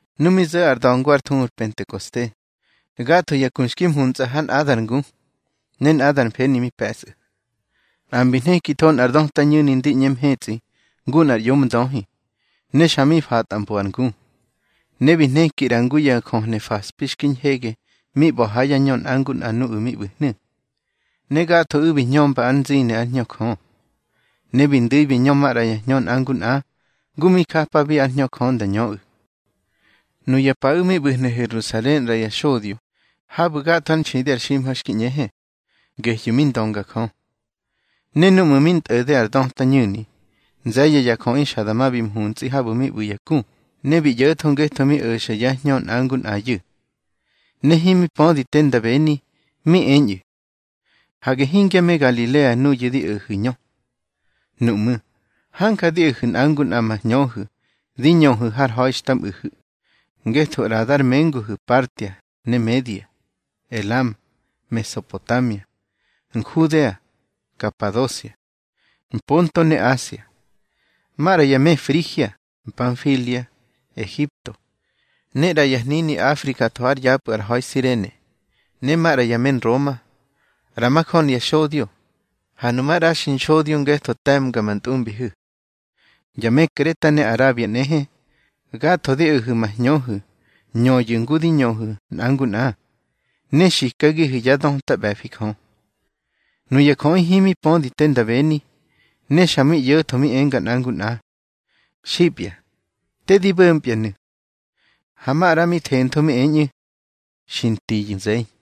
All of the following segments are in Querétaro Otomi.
Nu mi zo̱ ar da̱ngo ár thuhu Pentekoste, gatho ya ku xki mhuntsꞌa ha nꞌadar ngu, ne nꞌadar mfeni mi pe̱sꞌu̱. Nꞌa mbi nhekitho nꞌar döta ñu̱ni ndi ꞌñe mhetsꞌi ngu nꞌar ꞌyomndöhi, ne xa bi fatꞌa mbo ar ngu. Ne bi nheki ꞌra ngu ya jöhne faspi xki ñhege mi ꞌba̱ ha yá ñö nꞌa ngu nꞌa nuꞌu̱ mi ꞌbu̱hnu̱. Ne gathoꞌu̱ bi hñömba ár nzini ár Hñö Jö, ne bi ndu̱i bi ñö maꞌra ya hñö nꞌa ngu nꞌa, ngu mi japabi ár Hñö Jö nda ñöꞌu̱. Nuya paꞌu̱ mi ꞌbu̱hnu̱ Herusalen ꞌra ya xodyo, habu̱ gatho ár nxidi ar ximha̱i xki ꞌñehe, gehyu̱ mi ndönga Jö. Ne núꞌmu̱ mi ntꞌo̱de ar döta ñu̱ni, nze̱ye̱ ya jöꞌi xa dama bi mhuntsꞌi habu̱ mi ꞌbu̱ ya ku, ne bi ꞌyo̱tho ngetho mi o̱xa yá hñö nꞌa ngu nꞌayu̱. Ne himi pödi te nda beni, mi eñꞌu̱: —Hage hingya me Ngalilea nuyu̱ di o̱hu̱ ñö. Nuꞌmú̱, hanja di o̱hu̱ nꞌa ngu nꞌa ma hñöhu̱ di ñöhu̱ har ha̱i xta mꞌu̱hu̱. Ngetho ꞌra dar menguhu̱ Partia ne Media, Elam, Mesopotamia, Nhudea, Kapadosia, Mponto, ne Asia. Maꞌra ya me Frigia, Panfilia, Ehipto, ne ꞌra ya hnini Afrika tho ár yapꞌu̱ ar ha̱i Sirene. Ne maꞌra ya me Nroma, ꞌra majöni ya xodyo, ha nu maꞌra xi nxodyo ngetho te̱mga ma ntꞌumbihu̱. Ya me Kreta ne Arabia nꞌehe, gatho di o̱hu̱ ma hñöhu̱ ñöyu̱ ngu di ñöhu̱ nꞌa ngu nꞌa, ne xikagihu̱ yá döta ꞌbe̱fi Jö. Nuya jöꞌi himi pödi te nda beni, ne xa mi ꞌyo̱tho mi enga nꞌa ngu nꞌa: —Xipya, te di bo̱mpyanu̱. Ha maꞌra mi thentho mi eñꞌu̱: —Xi ntiyu̱ zëi.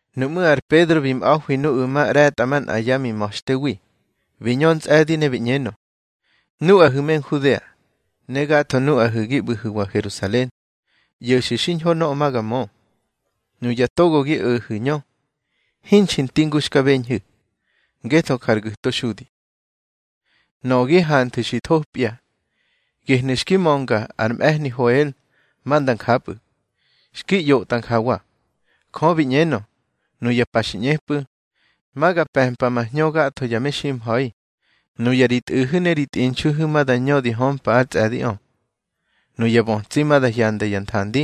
Nuꞌmú̱ ar Pedro bi mꞌa̱hwi nuꞌu̱ ma ꞌre̱tꞌamanꞌa yá mi ma̱xtewi. Bi ñö ntsꞌe̱di ne bi ꞌñenö: —Nuꞌahu̱ me Nhudea, ne gatho nuꞌahu̱ gi ꞌbu̱hu̱wa Herusalen, ꞌyo̱xu̱ xiñho nöꞌö ma ga mö. Nuya togo gi o̱hu̱ ñö, hinxi nti ngu xka beñhu̱, ngetho jar gu̱to xudi. Nöꞌö gi hanthu̱ xi thopya, gehnu̱ xki mönga ar mꞌe̱hni Hoel ma nda njapꞌu̱. Xki ꞌyotꞌa njawa: Jö bi ꞌñenö: Nuya pa xi ꞌñepꞌu̱, ma ga pe̱mpa ma Hñö gatho ya meximha̱i. Nuya ri tꞌu̱hu̱ ne ri tꞌinxuhu̱ ma da ñö di hömpa ár tsꞌe̱diꞌö. Nuya bötsi ma da hyanda ya nthandi,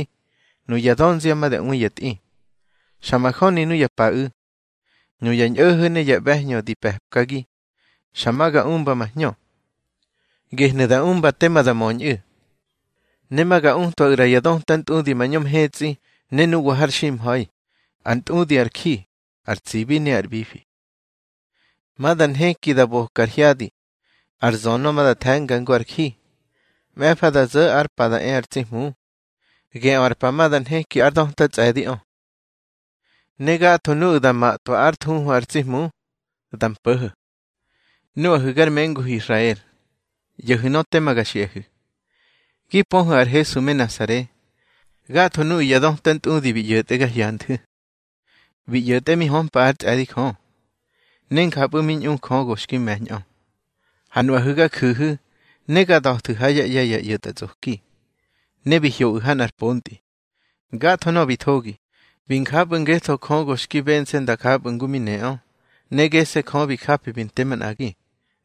nuya dönzia ma da ꞌwi ya tꞌi. Xa majöni nuya paꞌu̱, nuya ñꞌo̱ho̱ ne ya ꞌbe̱hñö di pe̱pkagi, xa ma ga umba ma Hñö. Gehnu̱ da umba tema da möñꞌu̱. Ne ma ga utꞌwaꞌu̱ ꞌra ya döta ntꞌudi mañö mhetsꞌi ne nuwa har ximha̱i, ár ntꞌudi ar ji, ar tsibi, ne ar ꞌbifi. Ma da nheki da boka ar hyadi. Ar zönö ma da the̱nga ngu ar ji. Mꞌe̱fa da zo̱ ar pa da e ar tsi Hmu. Geꞌö ar pa ma da nheki ár döta tsꞌe̱diꞌö. Ne gatho nuꞌu̱ da matwa ár thuhu ar tsi Hmu, da mpo̱ho̱. Nuꞌahu̱ gar menguhu̱ Israel, ꞌyo̱hu̱ nöꞌö tema ga xiꞌahu̱: Gi pöhu̱ ar Hesu me Nasare, gatho nuꞌu̱ ya döta ntꞌudi bi ꞌyo̱tꞌe ga hyanthu̱, bi ꞌyo̱tꞌe mi hömpa ár tsꞌe̱di Jö, ne njapꞌu̱ mi ñꞌu Jö go xki me̱ñꞌö. Ha nuꞌahu̱ ga ju̱hu̱, ne ga da̱thu̱ ha yá ꞌye̱ ya ꞌyo̱tꞌatsꞌoki, ne bi hyoꞌu̱ ha nꞌar pontꞌi. Gatho nöꞌö bi thogi, bi njapꞌu̱ ngetho Jö go xki bense̱ nda japꞌu̱ ngu mi neꞌö. Ne gese̱ Jö bi japi bi nte manꞌagi.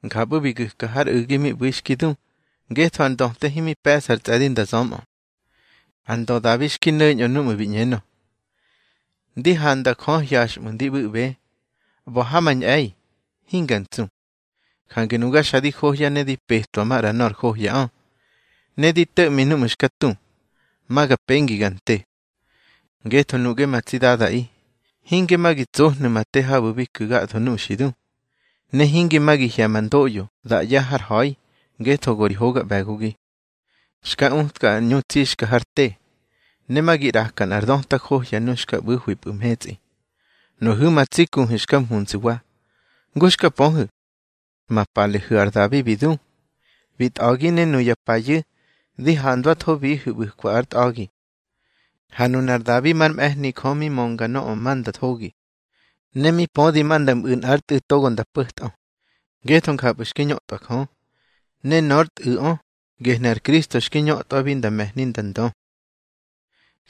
Njapꞌu̱ bi gu̱ka har u̱gi mi ꞌbu̱i xki du, ngetho ar ndöte himi pe̱ꞌsa ar tsꞌe̱di nda zömꞌö. Ar ndö Dabi xki no̱ñꞌö núꞌmu̱ bi ꞌñenö: Ndi handga Jö hyaxꞌmu̱ ndi ꞌbu̱ꞌbe, ꞌba̱ ha ma ñꞌe̱i, hinga ntsu. Jange nuga xa di johya ne di petwa maꞌra nor johyaꞌö. Ne di to̱ꞌmi núꞌmu̱ xka tu, ma ga pengi ga nte. Ngetho nuꞌge, ma tsi Dadaꞌi, hinge ma gi tsohnu̱ ma te habu̱ bi ku̱ gatho nuꞌu̱ xi du. Ne hingi ma gi hye̱ ma ndoꞌyo da ꞌya har ha̱i, ngetho go ri hoga ꞌbe̱gogi. Xka utka ar ꞌñu tsixka har te, ne ma gi ꞌraka nꞌar döta johya nu xka ꞌbu̱hwipu̱ mhetsꞌi. Nuꞌahu̱ ma tsi kuhu̱ xka mhunshu̱wa, ngu xka pöhu̱, ma palehu̱ ar Dabi bi du, bi tꞌa̱gi, ne nuya payu̱ di handwathobihu̱ ꞌbu̱kwa ár tꞌa̱gi. Ha nunar Dabi már mꞌe̱hni Jö mi mönga nöꞌö ma nda thogi. Ne mi pödi ma nda mꞌu̱ nꞌár tꞌu̱ togo nda po̱tꞌö, ngetho njapꞌu̱ xki ñötꞌwa Jö. Ne nór tꞌu̱ꞌö gehnu̱ ar Kristo xki ñhötꞌwabi nda mꞌe̱hni nda ndö.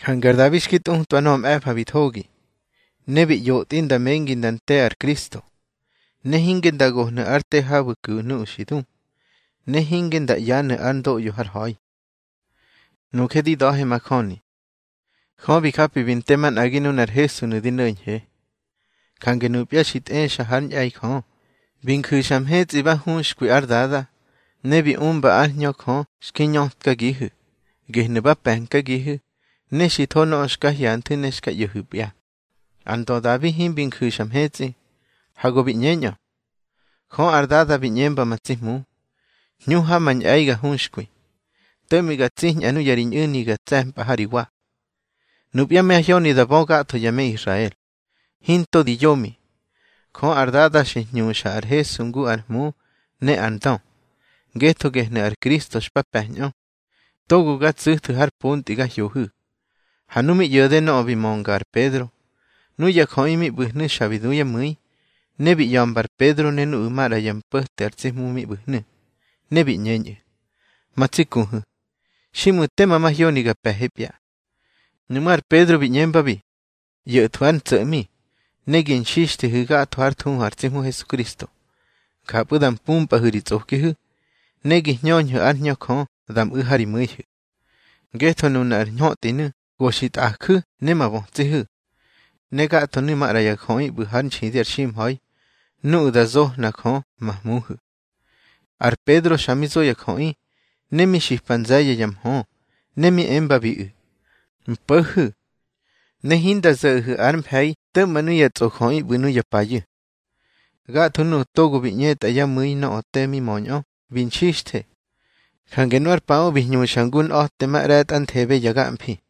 Jange ar Dabi xki tꞌutwa nöꞌö mꞌe̱fa bi thogi. Ne bi ꞌyotꞌi ma nda mengi nda nte ar Kristo, ne hinge nda gohnu̱ ár te habu̱ ku̱ nuꞌu̱ xi du, ne hinge nda ꞌyanu̱ ár ndoꞌyo har ha̱i. Nuje di da̱he majöni, Jö bi japi bi nte manꞌagi nunar Hesunu̱ di no̱ñhe. Jange nupya xi tꞌexa hár ñꞌe̱i Jö, bi nju̱xa mhetsꞌi ba huxkwi ár Dada. Ne bi umba ár Hñö Jö xki ñhötkagihu̱. Gehnu̱ ba pe̱nkagihu̱, ne xi tho nöꞌö xka hyanthu̱ ne xka ꞌyo̱hu̱pya. Ar ndö Dabi himbi nju̱xa mhetsꞌi, ha go bi ꞌñeñꞌö: Jö ar Dada bi ꞌñemba ma tsi Hmu: Hñu ha ma ñꞌe̱i ga huxkwi, to̱ꞌmi ga tsiñꞌa nuya ri ñꞌu̱ni ga tse̱pꞌa ha ri wa. Nupya, mahyoni da bö gatho ya me Israel, hinto di yomi: Jö ar Dada xi hñuxa ar Hesu ngu ar Hmu ne ar Ndö, ngetho gehnu̱ ar Kristo xpa pe̱ñꞌö, togo ga tsu̱thu̱ har pontꞌi ga hyohu̱. Ha nu mi ꞌyo̱de nöꞌö bi mönga ar Pedro, nuya jöꞌi mi ꞌbu̱hnu̱ xa bi du yá mu̱i, ne bi ꞌya̱mba ar Pedro ne nuꞌu̱ maꞌra yá mpo̱te ar tsi Hmu mi ꞌbu̱hnu̱, ne bi ꞌñeñꞌu̱: —Ma tsi kuhu̱, xiꞌmu̱ tema mahyoni ga pe̱hepya. Nuꞌmú̱ ar Pedro bi ꞌñembabi: —ꞌYo̱thu̱ ár ntso̱ꞌmi, ne gi nxixthehu̱ gatho hár thuhu ar tsi Hmu Hesukristo. Njapꞌu̱ da pumpꞌahu̱ ri tsꞌokihu̱, ne gi hñöñhu̱ ár Hñö Jö da mꞌu̱ ha ri mu̱ihu̱. Ngetho nuna ar ñhötꞌinu̱ go xi tꞌaju̱ ne ma bötsihu̱, ne gatho nuya maꞌra ya jöꞌi ꞌbu̱ hár nxidi ar ximha̱i, nuꞌu̱ da zohna Jö ma Hmuhu̱. Ar Pedro xa mi zo ya jöꞌi, ne mi xipa nze̱ye̱ ya mhö, ne mi embabiꞌu̱: —Mpo̱hu̱, ne hinda zu̱ꞌahu̱ ár mfe̱i to̱ꞌma nuya tsꞌojöꞌi ꞌbu̱ nuya payu̱. Gatho nuꞌu̱ togo bi ꞌñetꞌa yá mu̱i nöꞌö te mi möñꞌö, bi nxixthe. Jange nu ar paꞌö bi hñuxa ngu nꞌa̱temaꞌre̱tꞌanthebe ya gamfi.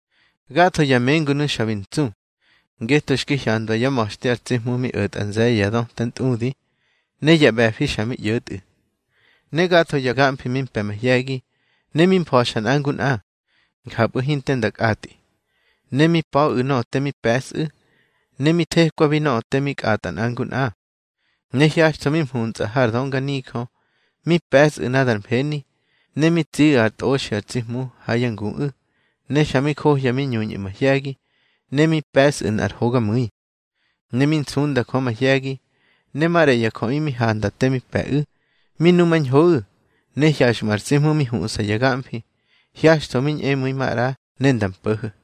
Gatho ya mengunu̱ xa bi ntsu, ngetho xki hyandwa yá ma̱xte ar tsi Hmu mi o̱tꞌa nze̱ye̱ ya döta ntꞌudi, ne ya ꞌbe̱fi xa mi ꞌyo̱tꞌu̱. Ne gatho ya gamfi mi mpe̱ mahye̱gi, ne mi mfa̱xa nꞌa ngu nꞌa, njapꞌu̱ hinte nda kꞌatꞌi. Ne mi pa̱ꞌu̱ nöꞌö te mi pe̱sꞌu̱, ne mi thekwabi nöꞌö te mi kꞌatꞌa nꞌa ngu nꞌa. Ne hyaxtho mi mhuntsꞌa har dönganijö, mi pe̱sꞌu̱ nꞌadar mfeni. Ne mi tsiꞌu̱ ár tꞌoxi ar tsi Hmu ha yá nguꞌu̱, ne xa mi johya mi ñuñꞌu̱ mahye̱gi, ne mi pe̱sꞌu̱ nꞌar hogamu̱i. Ne mi nsunda Jö mahye̱gi. Ne maꞌra ya jöꞌi mi handa te mi pe̱ꞌu̱, mi numañhoꞌu̱. Ne hyaxꞌmu̱ ar tsi Hmu mi huꞌsa ya gamfi, hyaxtho mi ñꞌemu̱i maꞌra ne nda mpo̱ho̱.